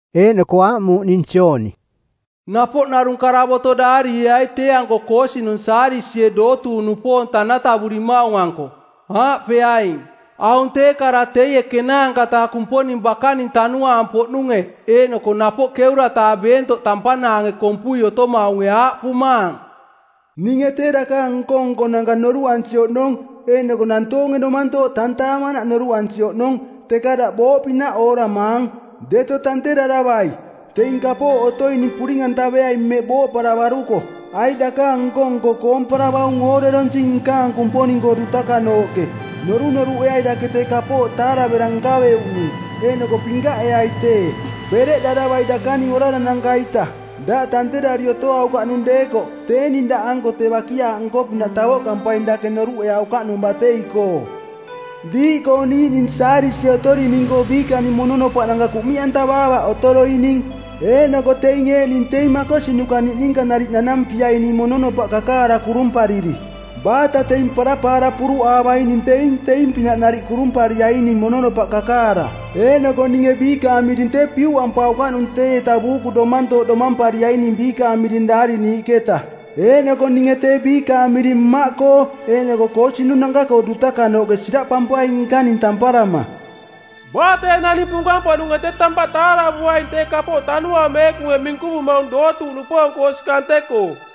Eeꞌnoko aaꞌmuuꞌ ning Jooni, “Napoꞌ narung karavoto daarieai tee-anko koosinung Saadisie dootuuꞌnupoong tanatavurimaung-anko. Aaꞌpeaing, ‘Aung tee kara teie ˜kenaanka-taa Kumponing bakaning tanuaang-poꞌnunge eeꞌnoko napoꞌ ˜keura-taa beentoꞌ tampanaange kompui otomaunge aaꞌpumaang, “Ninge tee dakaang nko-nkonanka noruꞌansi oꞌnong eeꞌnoko nantoonge domantooꞌ tantaamanaꞌ noruꞌansi oꞌnong, teka daꞌ booꞌpinaꞌ ooramaang. Deto tanteraravai! Teing kapooꞌ otoining puring-antaveai mmeꞌ booꞌparavaruko, aiꞌ dakaang nko-nko koomparavaung ooreronsing nkaang Kumponing-koo dutakanooꞌke. Norunoruꞌeai dake tee kapooꞌ taaravera nkaveuꞌnung, eeꞌnoko pinkaꞌeai tee. Bereꞌdaravai dakaning orarananka-ita. Daꞌ tanterari otoaukaꞌnung deekoꞌ tee ning daꞌanko tee bakiaaꞌ nko-pinaꞌ tavoꞌkampaing dake noruꞌeaukaꞌnung batei-koo. Diiꞌkoo niiꞌning Saadisie otorining-koo biikaning mononopaꞌnanka kuꞌmiꞌantavaavaꞌ otoroining. Eeꞌnoko teing eeꞌning teing makosinuka niꞌninka nariꞌ nanampiaining mononopaꞌ kakaara kurumpariri. Baata teing parapaara puruꞌaavaining teing teing-pinaꞌ nariꞌ kurumpariaining mononopaꞌ kakaara, eeꞌnoko ninge biikaang miring tee piuꞌampaukaꞌnung teieta buuku domantooꞌ domampariaining biikaang miring daariniiꞌketa. Eeꞌnoko ninge tee biikaang miring Mmaꞌkoo eeꞌnoko koosinunanka-koo dutaka-nooꞌke siraꞌpampaing nkaning tamparama. Baa tee naning punkang-poꞌnunge tee tampaꞌ taaravuaing tee kapooꞌ Tanuaang Meekunge minkuvumaung dootuuꞌnupoong-koo osi kante-koo.”’”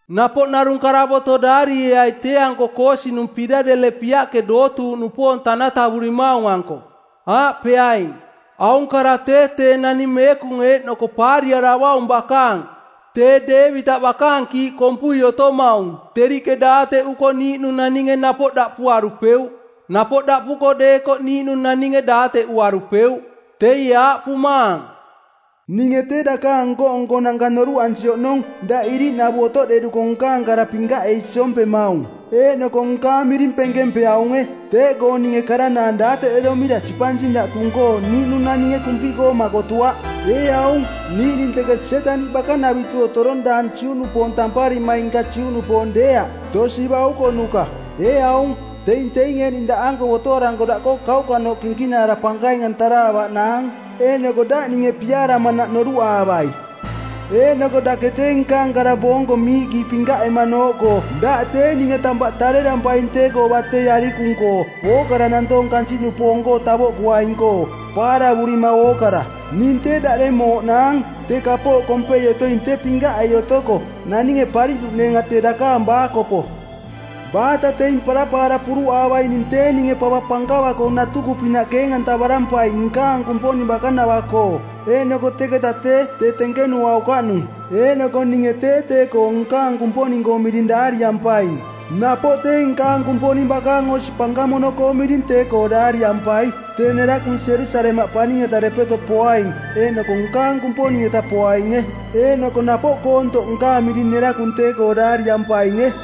“Napoꞌ narung karavoto daarieai tee-anko koosinung Piladelepiaꞌke dootuuꞌnupoong tanatavurimaung-anko. Aaꞌpeaing, ‘Aung kara tee tee Naning Meekung eeꞌnoko Paariaravaung bakaang, tee Deevitaꞌ bakaang kiiꞌ kompui otomaung teriꞌke daateꞌuko niiꞌnung naninge napoꞌ daꞌpuarupeuꞌ, napoꞌ daꞌpuko deekoꞌ niiꞌnung naninge daateꞌuarupeuꞌ. Teie aaꞌpumaang, “Ninge tee dakaang nko-nkonanka noruꞌansi oꞌnong daꞌ iriꞌnavu otoꞌderuko nkaang kara pinkaꞌei siompemaung. Eeꞌnoko nkaang miring penkempeaunge. Teeꞌkoo ninge karanaang daateꞌderomira sipansing daꞌ tung-koo niiꞌnung naninge kumpiꞌkoo makotuaꞌ. Ee aung, niiꞌning teke Sietaniꞌ bakanavitu otorong daang Juꞌnupoong tamparimaing nka Juꞌnupoong deeaꞌ, tosi baukonuka. Ee aung, teing teing eeꞌning daꞌanko botoaranko daꞌkoo kauꞌkanooꞌ kinkinaara pankaing-antaraavaꞌnaang, eeꞌnoko daꞌ ninge piaaramanaꞌ noruꞌaavai. Eeꞌnoko dake tee nkaang kara boonko miiꞌkii pinkaꞌemanooꞌkoo daꞌ tee ninge tampaꞌ tarerampaing tee-koo batei parapaara arikung-koo ookara nantoong kansiꞌnupoong-koo tavoꞌkuaing-koo, paaravurima ookara. Ning tee daꞌdeng mooꞌnaang, tee kapooꞌ kompei otoing tee pinkaꞌei otoko, naninge pariꞌduꞌneenga tee dakaang baakopo. Baata teing parapaara puruꞌaavaining tee ninge pava pankava-koo natuku pinaꞌ keeng-antavarampaing nkaang Kumponing bakanava-koo. Eeꞌnoko teketa tee tee tenkenuaukaꞌnung, eeꞌnoko ninge tee tee-koo nkaang Kumponing-koong miring daariampaing. Napoꞌ tee nkaang Kumponing bakaang osi pankamono-koong miring tee-koo daariampai, tee nerakung Jerusalemaꞌ paning-eta depeto poaing eeꞌnoko nkaang Kumponing-eta poainge. Eeꞌnoko napoꞌ koontoꞌ nkaang miring nerakung tee-koo daariampainge.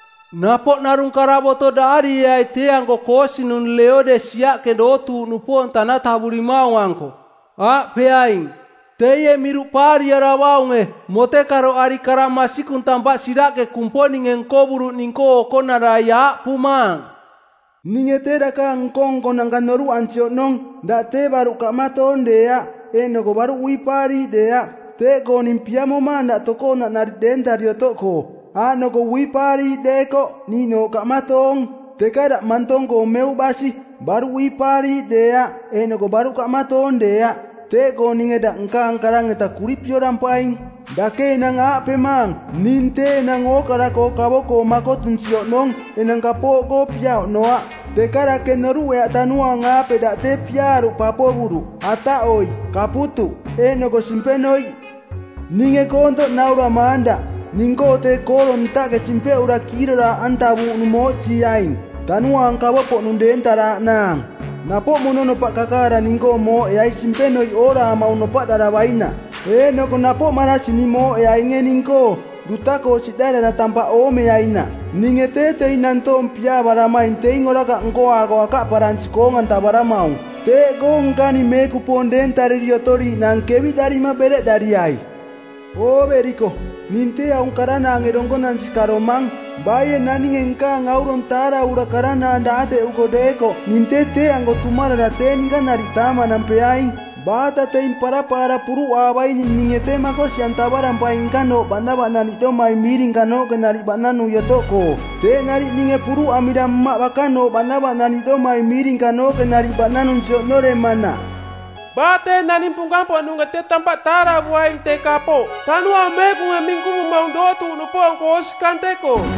“Napoꞌ narung karavoto daarieai tee-anko koosinung Leodesiaꞌke dootuuꞌnupoong tanatavurimaung-anko. Aaꞌpeaing, ‘Teie Miruꞌ Paariaravaunge, Motekaroꞌari Kara Masikung Tampaꞌ Siraꞌke Kumponinge nkovuruꞌning-koo okonarai aaꞌpumaang, “Ninge tee dakaang nko-nkonanka noruꞌansi oꞌnong, daꞌ tee baruꞌ kaꞌmatoong deeaꞌ eeꞌnoko baruꞌ uipaariiꞌ deeaꞌ. Teeꞌkoo ning piamomaang daꞌ tokoonaꞌ nariꞌ deentari otoꞌkoo, aaꞌnoko uipaariiꞌ deekoꞌ niiꞌnooꞌ kaꞌmatoong. Teka daꞌ mantong-koo meuꞌ basi, baruꞌ uipaariiꞌ deeaꞌ eeꞌnoko baruꞌ kaꞌmatoong deeaꞌ, teeꞌkoo ninge daꞌ nkaang karang-eta kuripiorampaing. Dake enang aaꞌpemaang, ‘Ning tee enang ookara-koo kavo-koo makotunsi oꞌnong; enang kapooꞌkoo pia oꞌnoaꞌ.’ Teka dake noruꞌeaꞌ tanuaang-aape daꞌ tee piaaruꞌ papovuruꞌ, ataꞌoiꞌ, kaputuꞌ, eeꞌnoko simpenoiꞌ. Ninge koontoꞌ nauramaang daꞌ, ning-koo tee kooro ntaꞌke simpeꞌura kiiroraaꞌantavuuꞌnung mooꞌsiiaing, tanuaang kavo-poꞌnung deentaraaꞌnaang. Napoꞌ mononopaꞌ kakaara ning-koo mooꞌeai simpenoiꞌ ooraamaung nopaꞌdaravainaꞌ. Eeꞌnoko napoꞌ marasini mooꞌeainge ning-koo, duta-koo siꞌdarara tampaꞌ oomeainaꞌ. Ninge tee teing nantoong piaavaramaing teing orakaꞌ nkoaako akaꞌparansi koong-antavaramaung. Teeꞌkoo nkaning meekupoong deentariri otoriiꞌnaang keviꞌdarima bereꞌdariai! Ooveriko, ning tee aung karanaange donkonansi karomang. Baie naninge nkaang aurong taaravura karanaang daateꞌuko deekoꞌ ning tee tee-anko tumarara tee ninka nariꞌ taamanampeaing. Baata teing parapaara puruꞌaavaining ninge tee makosi-antavarampaing nkanooꞌ baꞌnavaꞌnaniꞌdomai miirinkanooꞌke nariꞌ baꞌnanui otoꞌkoo, teeꞌ nariꞌ ninge puruꞌamira Mmaꞌ bakanooꞌ baꞌnaniꞌdomai miirinkanooꞌke nariꞌ baꞌnanunsi oꞌnoremanaꞌ. Baa tee naninge punkang-poꞌnunge tee tampaꞌ taaravuaing tee kapooꞌ Tanuaang Meekunge minkuvumaung dootuuꞌnupoong-koo osi kante-koo.”’”